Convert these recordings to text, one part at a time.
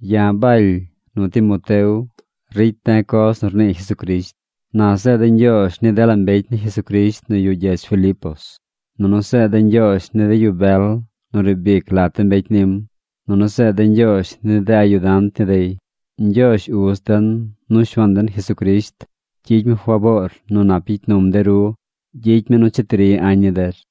Ya̱ Baly nu Timoteo ricy de̱ coz nu rnii Jesucrisht. Na zeed de̱ ñgyoozh ni dela mbecy ni Jesucrisht nu yuꞌ gyedz Filipos. Nunu zeed de̱ ñgyoozh ni de yu bel nu riib ic lat de mbecy nim, nunu zeed de̱ ñgyoozh ni de ayudant ni dey. Ñgyoozh Uz den, nu Shuaan den Jesucrisht gyicy mi faboor nu nap gyicy num de ru. Gyicy mi nu cheti ri añ ni der.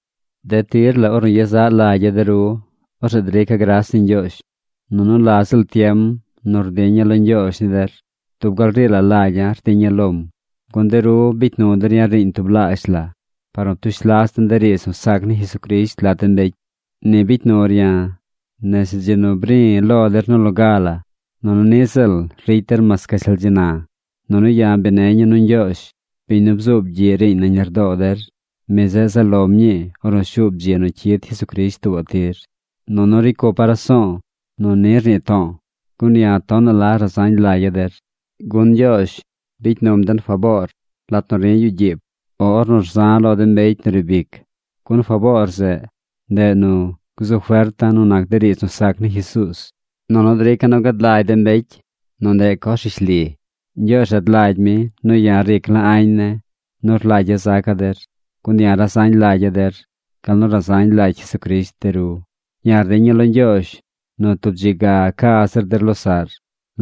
De tir la ornu yezaꞌ lagya̱ de ru, orzeꞌ drica̱ gras ni Ñgyoozh. Nunu la ziꞌl tiem nu rdiña̱ lo Ñgyoozh ni der, dub gal ri lagya̱ rdiña̱ lom, gun de ru bicy nu der ya̱ riiñ tublaazh la par nu ptush las den de riidz nu sac ni Jesucrisht lat de mbecy. Ni bicy nur ya̱ nese dzi nu bri̱ lo der nu loga la nunu niꞌ ziꞌl ricy der mas gashtal dzi na. Nunu ya̱ bi neña̱ nu Ñgyoozh, biñ nu bzuub gyiꞌ riiñ nañ lardoo der, mi zeꞌ zaꞌ lom ñii ornu shuub dzi nu cyid Jesucrisht tuubaꞌ tir. Nunu ricy cupa̱ raso̱o̱ nu ni rnii to̱o̱, gun ya̱ tonaꞌ la razañ lagya̱ der. Gun Ñgyoozh bicy num den faboor lat nu ri̱ yuꞌ gyiib, o ornu rza̱ lo de mbecy nu riib ic. Gun faboor zeꞌ, ndeꞌ nu gzu ferta̱ nu nac de riidz nu sac ni Jesuuz, nunu drica̱ nu gad lagy de mbecy nu ndeꞌ coz rishli. Ñgyoozh rad lagy mi nu ya̱ ric la añ ne̱ nu rlagya̱ zaca̱ der, gun ya̱ razañ lagya̱ der gal nu razañ lagy Jesucrisht de ru. Ya̱ rdiña̱ lo Ñgyoozh nu tub dzi ga ca zir der losaꞌr.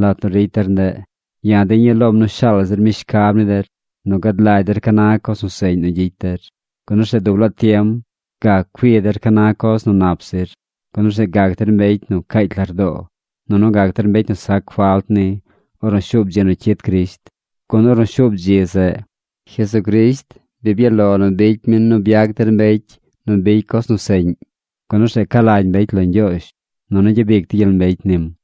Lat nu ricy der ndeꞌ, ya̱ diña̱ lom nu shaal zir mi shcab ni der nu gad lagy der ca na coz nu seꞌñ nu gyicy der. Gun orzeꞌ dub laa tiem gac cui der ca na coz nu nap zir, gun orzeꞌ gac der mbecy nu caacy lardoo, nunu gac der mbecy nu sac falt ni ornu shuub dzi nu cyid Crisht. Gun ornu shuub dzi zeꞌ, Jesucrisht bi byaꞌ lo nu bicy mi nu byac der mbecy nu bicy coz nu seꞌñ, gun orzeꞌ ca lagy mbecy lo Ñgyoozh nunu gyabic dey gyel mbecy nim.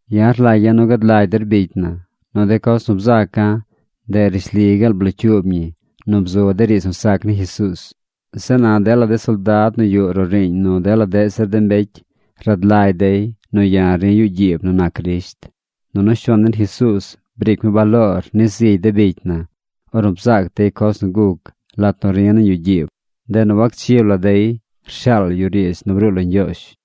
Ya̱ rlagya̱ nu gad lagy der bicy na, nu de coz nu bzaca̱ ndeꞌ rishli gaal blocyuub ñi nu bzu de riidz nu sac ni Jesuuz. Zeꞌ na dela de soldad nu yuꞌ roꞌ riiñ nu dela deꞌ zir mbecy rad lagy dey nu ya̱ ri̱ yuꞌ gyiib nu nac Crisht. Nunu Shuaan den Jesuuz briic mi baloor ni zigy de bicy na ornu bzaac dey coz nu guc lat nu ri̱ nañ yuꞌ gyiib. Ndeꞌ nu wacchib la dey rshaal yu riidz nu bruu lo Ñgyoozh.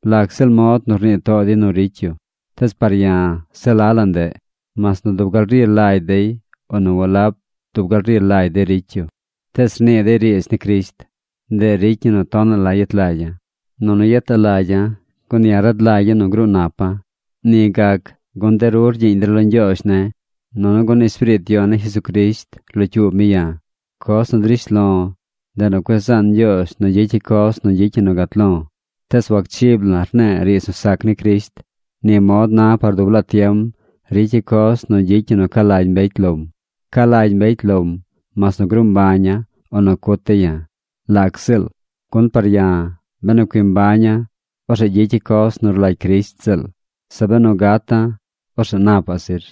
Lac ziꞌl mod nu rnii too dey nu ricy yu, tees par ya̱ se la la ndeꞌ. Mas nu dub gal ri lagy dey o nu walab dub gal ri lagy dey ricy yu, tees rnii dey riidz ni Crisht. Ndeꞌ ricy ñi nu tonaꞌ la yet lagya̱. Gun ya̱ rad lagya̱ nu gruu napa̱. Ni gac gun de ru rgyiiñ der lo Ñgyoozh ne̱ nunu gun Espiriit Yon ni Jesucrisht rlocyuub mi ya̱. Coz nu drish lo̱, ndeꞌ nu cueꞌ zaan Ñgyoozh nu gyicya̱ coz nu gyicy ñi nu gat lo̱. Tees wacchib la̱ rne̱e̱ riidz nu sac ni Crisht. Ni mod na par dub laa tiem ricya̱ coz nu gyicy ñi nu ca lagy mbecy lom. Ca lagy mbecy lom mas nu gruu mbaña̱ o nu cut dey ya̱. Lac ziꞌl. Gun par ya̱, benu cui mbaña̱, orzeꞌ gyicya̱ coz nu rlagy Crisht ziꞌl. Zeꞌ benu gata̱, orzeꞌ napaꞌ zir.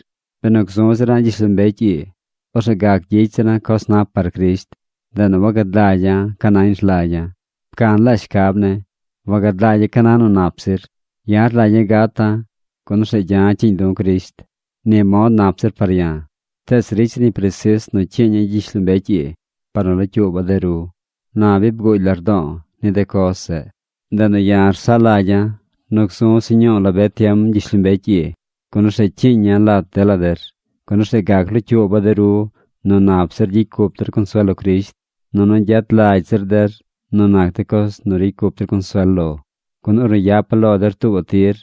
Benu gzu zira̱ gyishlombecy ii, orzeꞌ gac gyicy zira̱ coz nap par Crisht. Ndeꞌ nu wagad lagya̱ ca nañ rlagya̱. Pcan laa shcab ne̱. Wagad lagya̱ ca na nu nap zir. Ya̱ rlagya̱ gata̱, gun orzeꞌ gya̱ cyiiñ du̱ Crisht. Ni mod nap zir par ya̱. Tees ricy zir ñi presis nu cyiiña̱ gyishlombecy ii par nu locyuuba̱ de ru. Na bi bguugy lardo̱o̱ ni de coz zeꞌ, ndeꞌ nu ya̱ rsaꞌ lagya̱ nu gzu̱ se ñuu la be tiem gyishlombecy ii, gun orzeꞌ cyiiña̱ lat dela der, gun orzeꞌ gac locyuuba̱ de ru nu nap zir gyicy cup der consuel lo Crisht, nunu gyet lagy zir der nu nac de coz nu ricy cup der consuel lo. Gun ornu yapa̱ lo der tuubaꞌ tir,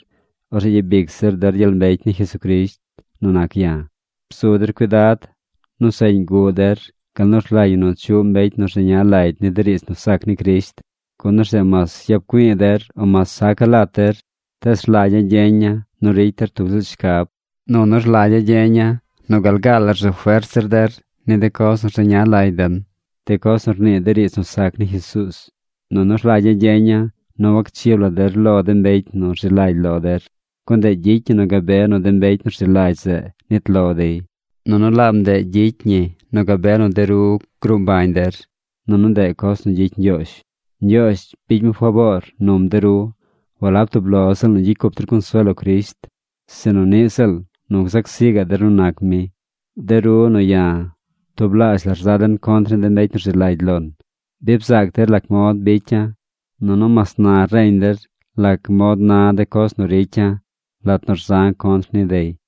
orzeꞌ gyabic zir der gyel mbecy ni Jesucrisht nu nac ya̱. Bzu der cuidad. Nu seꞌñ guꞌ der gal nu rlagy ñi nu chuꞌ mbecy nu rzeña lagy ni de riidz nu sac ni Crisht. Gun orzeꞌ mas yap güi̱i̱ der o mas saca̱ lat der, tees rlagya̱ gyeña̱ nu ricy der tub ziꞌl shcab. Nunu rlagya̱ gyeña̱ nu gal gaa la rzu fert zir der ni de coz nu rzeña lagy den, de coz nu rnii de riidz nu sac ni Jesuuz. Nunu rlagya̱ gyeña̱ nu wacchib der lo de mbecy nu rzi lagy lo der, gun ndeꞌ gyicy ñi nu gabe nu de mbecy nu rzi lagy zeꞌ nit lo dey. Nunu laab ndeꞌ ricy ñi nu gabe nu de ru gruu mbañ der. Nunu ndeꞌ coz nu gyicy Ñgyoozh. Ñgyoozh bicy mi faboor num de ru walab tub lo ziꞌl nu gyicy cup der consuel lo Crisht, sinu niꞌ ziꞌl nu gzac zi gaꞌ der nu nac mi. De ru nu ya̱ tublaazh la rza den contr de mbecy nu rzi lagy lon. Bi bzaac der lac mod bicya̱. Nunu mas na reñ der lac mod na de coz nu ricya̱ lat nu rza̱ contr ni dey.